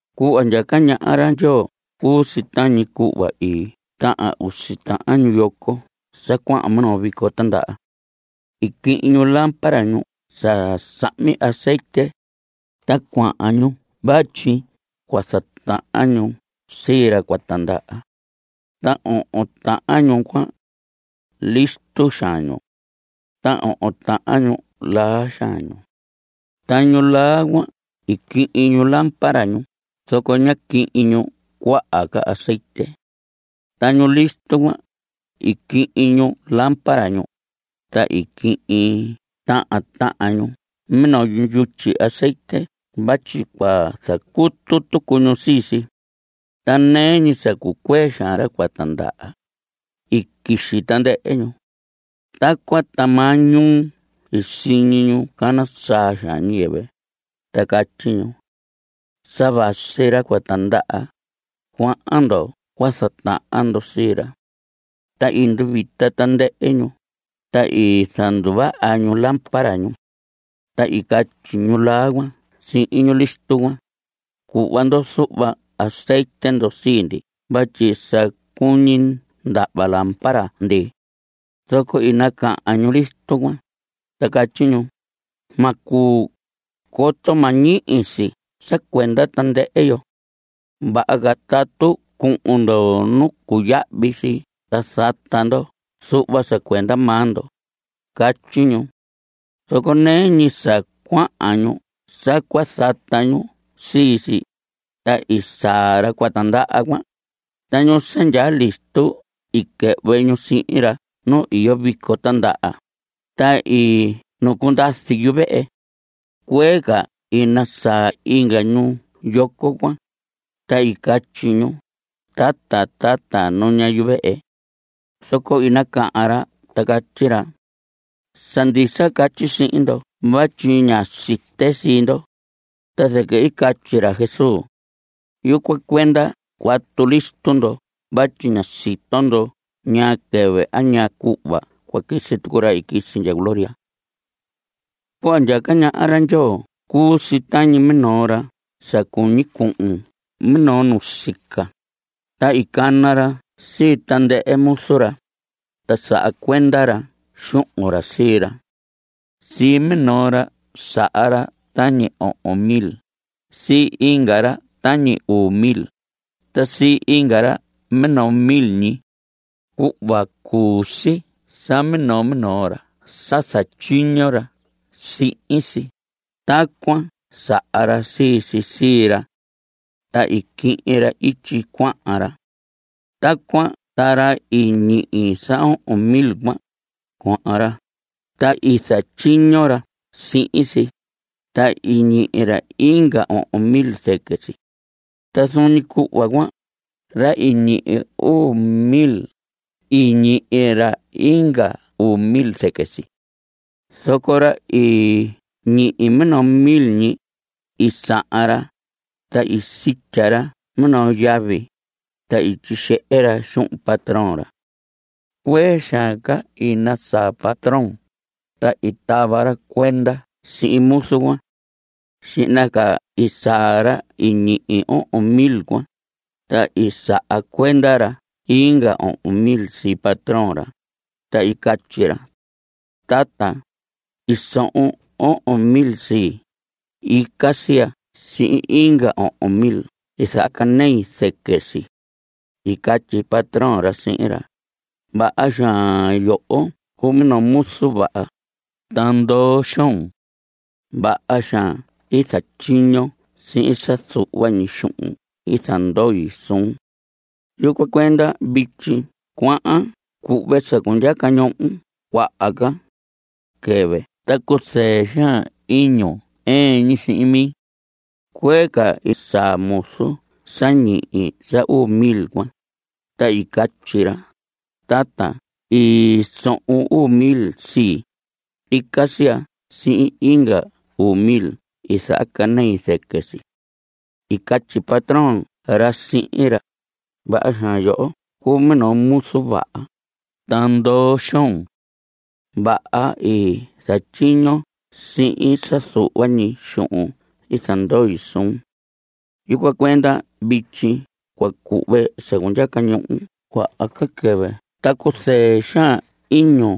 Cuhva ndyaca ñaha ra Ndyoo cuu si tañi cuhva i tahan usi tahan ñu yoco sa cuahan minoo vico tandaha. I quihin ñu lámpara ñu sa sahmi azetye, ta cuahan ñu vatyi cua zatahan ñu sii ra cua tindaha. Ta ohon tahan ñu cuan, listo xaan ñu. Ta ohon tahan ñu, laa xaan ñu. Ta ñu laa cuan, i quihin ñu lámpara ñu, zoco ñá quihin ñu cuaha ca azetye. Ta ñu listo cuan, i quihin ñu lámpara ñu, ta i quihin tahan tahan ñu minoo yutyi azetye vatyi cua zacutu tucu ñu sii si. Ta nɨɨ ñi sa cucuee xaan ra cua tindaha, i quixi tandɨhɨ ñu. Tacuan ta maañuu i siñi ñu cana saa ñiyɨvɨ, ta catyi ñu: “¡Sa vasi ra cua tindaha; cuahan ndo cua zatahan ndo sii ra!” Ta i nduvita tandɨhɨ ñu, ta i zanduvaha ñu lámpara ñu. Ta i catyi ñu laa cuan sihin ñu listo cuan: “Cuhva ndo zuhva azetye ndo sii ndi vatyi sa cuñi ndahva lámpara ndi.” Zoco i nacahan ñu listo cuan, ta catyi ñu: “Ma cuu, coto ma ñihi si sa cuenda tandɨhɨ yo. Vaha ca tatu cuhun ndo nu cuyahvi si ta zata ndo zuhva sa cuenda maa ndo.” Catyi ñu. Zoco nɨɨ ñi sa cuahan ñu sa cua zata ñu sii si, ta i saa ra cua tindaha cuan, ta ñu sa ndyaa listo i quɨhvɨ ñu sihin ra nu iyo vico tindaha, ta i nucundazi yuvehe. Cuee ca i nasaa inga ñu yoco cuan, ta i catyi ñu: “¡Tata, tata, nuña yuvehe!” Zoco i nacahan ra ta catyi ra: “Sa ndisa catyi sihin ndo vatyi ña site sii ndo.” Ta zɨquɨ i catyi ra Jesús: Yucuan cuenda cuatu listo ndo vatyi ña sito ndo ñaa quɨvɨ a ñaa cuhva cua quisi tucu ra i quisi ndya gloria. Cuhva ndyaca ñaha ra Ndyoo cuu si tañi minoo ra sa cuñi cuhun minoo ñuu nusica, ta i cana ra sii tandɨhɨ muzu ra, ta saha cuenda ra xuhun ra sii ra. Sii minoo ra saha ra tañi ohon mil, sii inga ra tañi uu mil, ta sii inga ra minoo mil ñi. Cuhva cuu sii sa minoo minoo ra sa zatyiño ra sihin si, tacuan saha ra sii si sii ra. Ta i quihin ra ityi cuahan ra. Tacuan ta ra i ñihi sa ohon mil cuan, cuahan ra, ta i zatyiño ra sihin si, ta i ñihi ra inga ohon mil zɨquɨ si. Ta zuun ñi cuhva cuan, ra i ñihi uu mil, i ñihi ra inga uu mil zɨquɨ si. Zoco ra i ñihi minoo mil ñi, i sahan ra, ta i sitya ra minoo yavi, ta i tyixehe ra xuhun patrón ra. Cuee xaan ca, i nasaa patrón, ta i tava ra cuenda sihin muzu cuan. Xihna ca i saa ra i ñihi ohon mil cuan, ta i saha cuenda ra inga ohon mil sii patrón ra, ta i catyi ra: “Tata, i sohon ohon mil sii. Ica si ya sihin inga ohon mil i zahacanei zɨquɨ si.” I catyi patrón ra sihin ra: “Vaha xaan; yoho cuu minoo muzu vaha, ta ndoo xoon. Vaha xaan i zatyiñon sihin sa zuhva ñi xuhun i zandoi suhun. Yucuan cuenda vityi cua cuhve sa cundyaca ñohon cuaha ca. Quɨhvɨ ta cuzɨɨ xaan iñun ɨɨn ñi sihin mi.” Cuee ca i saa muzu sa ñihi sa uu mil cuan, ta i catyi ra: “Tata, i sohon uu mil sii; ica si ya sihin inga uu mil i zahacanei zɨquɨ si.” I catyi patrón ra sihin ra: “Vaha xaan; yoho cuu minoo muzu vaha, ta ndoo xoon. Vaha i zatyiñon sihin sa zuhva ñi xuhun i zandoi suhun. Yucuan cuenda vityi cua cuhve sa cundyaca ñohon cuaha ca. Quɨhvɨ ta cuzɨɨ xaan iñun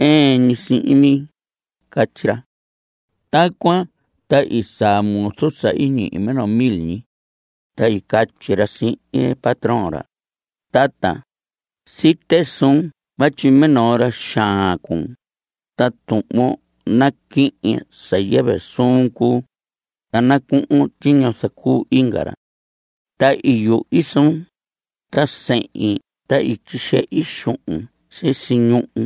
ɨɨn ñi sihin mi.” Catyi ra. Tacuan ta i saa muzu sa ñihi minoo mil ñi, ta i catyi ra sihin patrón ra: “Tata, site suun vatyi minoo ra xaan cuun, ta tuhvon naquihin sa yɨvɨ suun cuu, ta nacuhun tyiño zacuu inga ra. Ta i yuhi suun, ta sehin ta i tyixehi xuhun sisi ñuhu.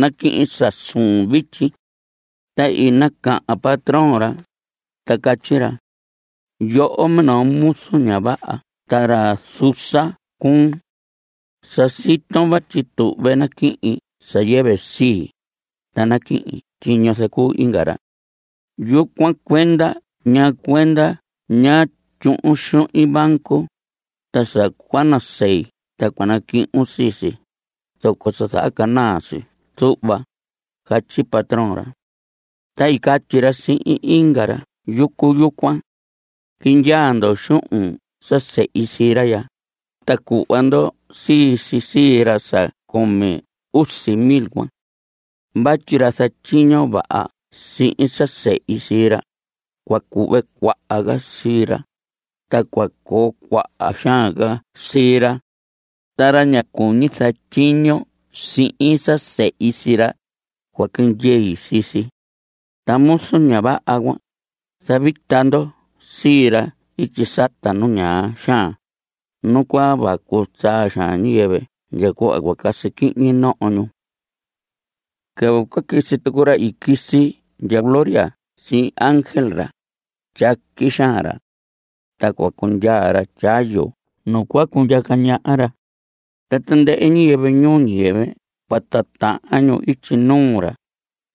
Naquihin sa suun vityi.” Ta i nacahan patrón ra, ta catyi ra: “Yoho, minoo muzu ña vaha ta ra zusa cuun. Sa siton vatyi tuhve naquihin sa yɨvɨ sii, ta naquihin tyiño zacuu inga ra. Yucuan cuenda ¿ñaa cuenda ñá tyuhun xuhin banco, ta sa cua nasei ta cua naquihin sii si, zoco sa zahacanaa si zuhva?” Catyi patrón cuan. Ta i catyi ra sihin inga ra yucu yucuan: “Quindyaa ndo xuhun sa sehi sii ra ya, ta cuhva ndo sii si sii ra sa cumi usi mil cuan. Vatyi ra zatyiño vaha sihin sa sehi sii ra, cua cuhve cuaha ca sii ra, ta cua coo cuaha xaan ca sii ra. Ta ra ña cuñi zatyiño sihin sa sehi sii ra, cua quindyei sii si. Ta muzu ña vaha cuan, zavita ndo sii ra ityi sata nu ñaa xaan, nu cua vacu xaan ñiyɨvɨ ndya cuhva cua casi quihñi noho ñu.” Quɨvɨ cua quisi tucu ra i quisi ndya gloria sihin ángel ra, tyaqui xaan ra. Ta cua cundyaa ra tyayu nu cua cundyaca ñaha ra. Ta tandɨhɨ ñiyɨvɨ ñuu ñiyɨvɨ cua titahan ñu ityi nuu ra,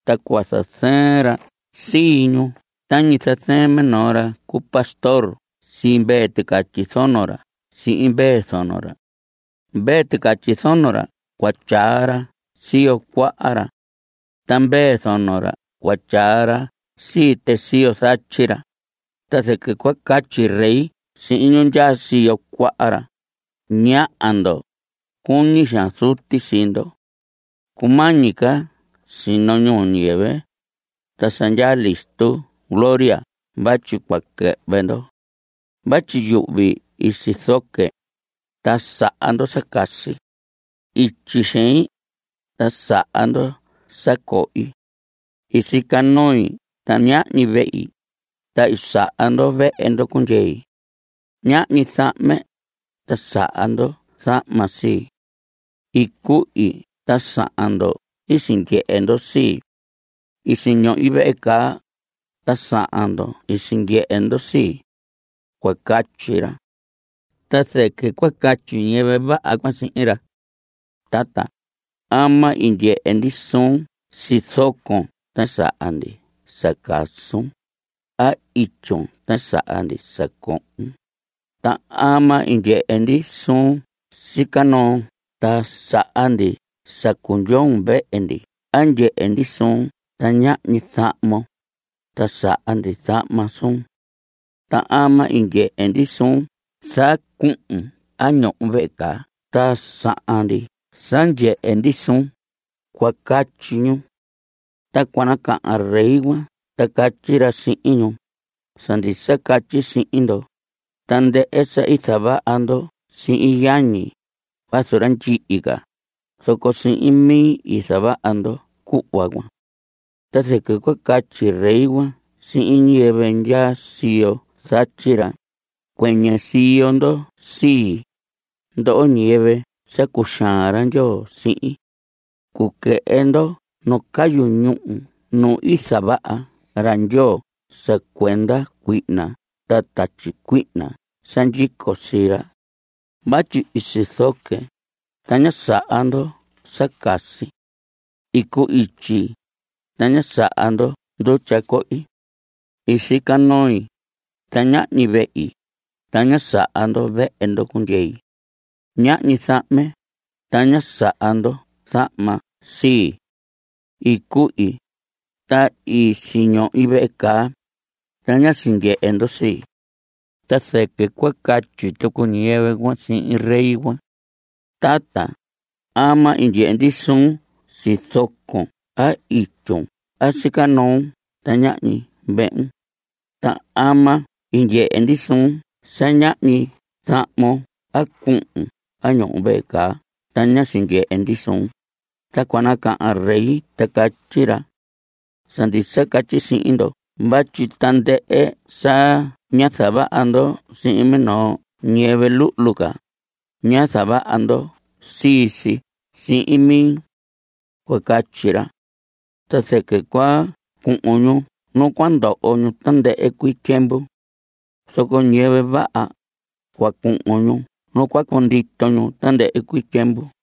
ta cua zazɨɨn ra sii ñu tañi zazɨɨn minoo ra cu pastor sii mvee ticatyi zono ra sihin mvee zono ra. Mvee ticatyi zono ra cua tyaa ra siyo cuaha ra. Ta mvee zono ra cua tyaa ra sii tɨ siyo zatyi ra. Ta zɨquɨ cua catyi Rey sihin ñu ndyaa siyo cuaha ra: “Ñaha ndo, Cuñi xaan Zuti sii ndo. Cumañi ca sino ñuu ñiyɨvɨ, ta sa ndyaa listo gloria vatyi cua quɨhvɨ ndo. Vatyi yuhvi i sizoque, ta saha ndo sa casi. Ityi xein, ta saha ndo sa cohi. I sica noi ta ñahñi vehi, ta i saha ndo vehe ndo cundyei. Ñahñi zahme, ta saha ndo zahma sii. I cuhi ta sahan ndo i sindyehe ndo sii. I siñohi vehe caa, ta sahan ndo i sindyehe ndo sii.” Cua catyi ra. Ta zɨquɨ cua catyi ñiyɨvɨ vaha cuan sihin ra: “Tata, ¿ama i ndyehe ndi suun sizocon ta saha ndi sa casun, a ityun ta saha ndi sa cohon? ¿Ta ama i ndyehe ndi suun sica noo ta saha ndi sa cundyoon vehe ndi a ndyehe ndi suun ta ñahñi zahmon, ta saha ndi zahma suun? ¿Ta ama i ndyehe ndi suun sa cuhun a ñohon vehe caa ta sahan ndi sa ndyehe ndi suun?” Cua catyi ñu. Ta cua nacahan Rey cuan ta catyi ra sihin ñu: “Sa ndisa catyi sihin ndo, tandɨhɨ sa i zavaha ndo sihin yañi, vazu ra ndyihi ca, zoco sihin mi i zavaha ndo cuhva cuan.” Ta zɨquɨ cua catyi Rey cuan sihin ñiyɨvɨ ndyaa siyo zatyi ra: “Cuɨñɨ siyo ndo sii, ndoho ñiyɨvɨ sa cuxaan ra Ndyoo sihin. Cuquɨhɨ ndo nu cayu ñúhu nu i zavaha Ndyoo sa cuenda cuihna ta tatyi cuihna sa ndyico sii ra. Vatyi i sizoque, ta ñá saha ndo sa casi. I cu‑ityi, ta ñá saha ndo ndutya cohi. I sica noi, ta ñahñi vehi, ta ñá saha ndo vehe ndo cundyei. Ñahñi zahme, ta ñá saha ndo zahma sii. I cuhi, ta i siñohi vehe caa, ta ñá sindyehe ndo sii.” Ta zɨquɨ cua catyi tucu ñiyɨvɨ cuan sihin Rey cuan: “Tata, ¿ama i ndyehe ndi suun sizocon a ityun a sica noo ta ñahñi vehun? ¿Ta ama i ndyehe ndi suun sa ñahñi zahmon a cuhun a ñohon vehe caa ta ñá tyindyee ndi suun?” Ta cua nacahan Rey ta catyi ra: “Sa ndisa catyi sihin ndo vatyi tandɨhɨ sa ñá zavaha ndo sihin minoo ñiyɨvɨ luhlu ca, ñá zavaha ndo sii si sihin mi.” Cua catyi ra. Ta zɨquɨ cua cuhun ñu nu cua ndoho ñu tandɨhɨ cuii tyiemvu. Zoco ñiyɨvɨ vaha, cua cuhun ñu nu cua cundito ñu tandɨhɨ cuii tyiemvu.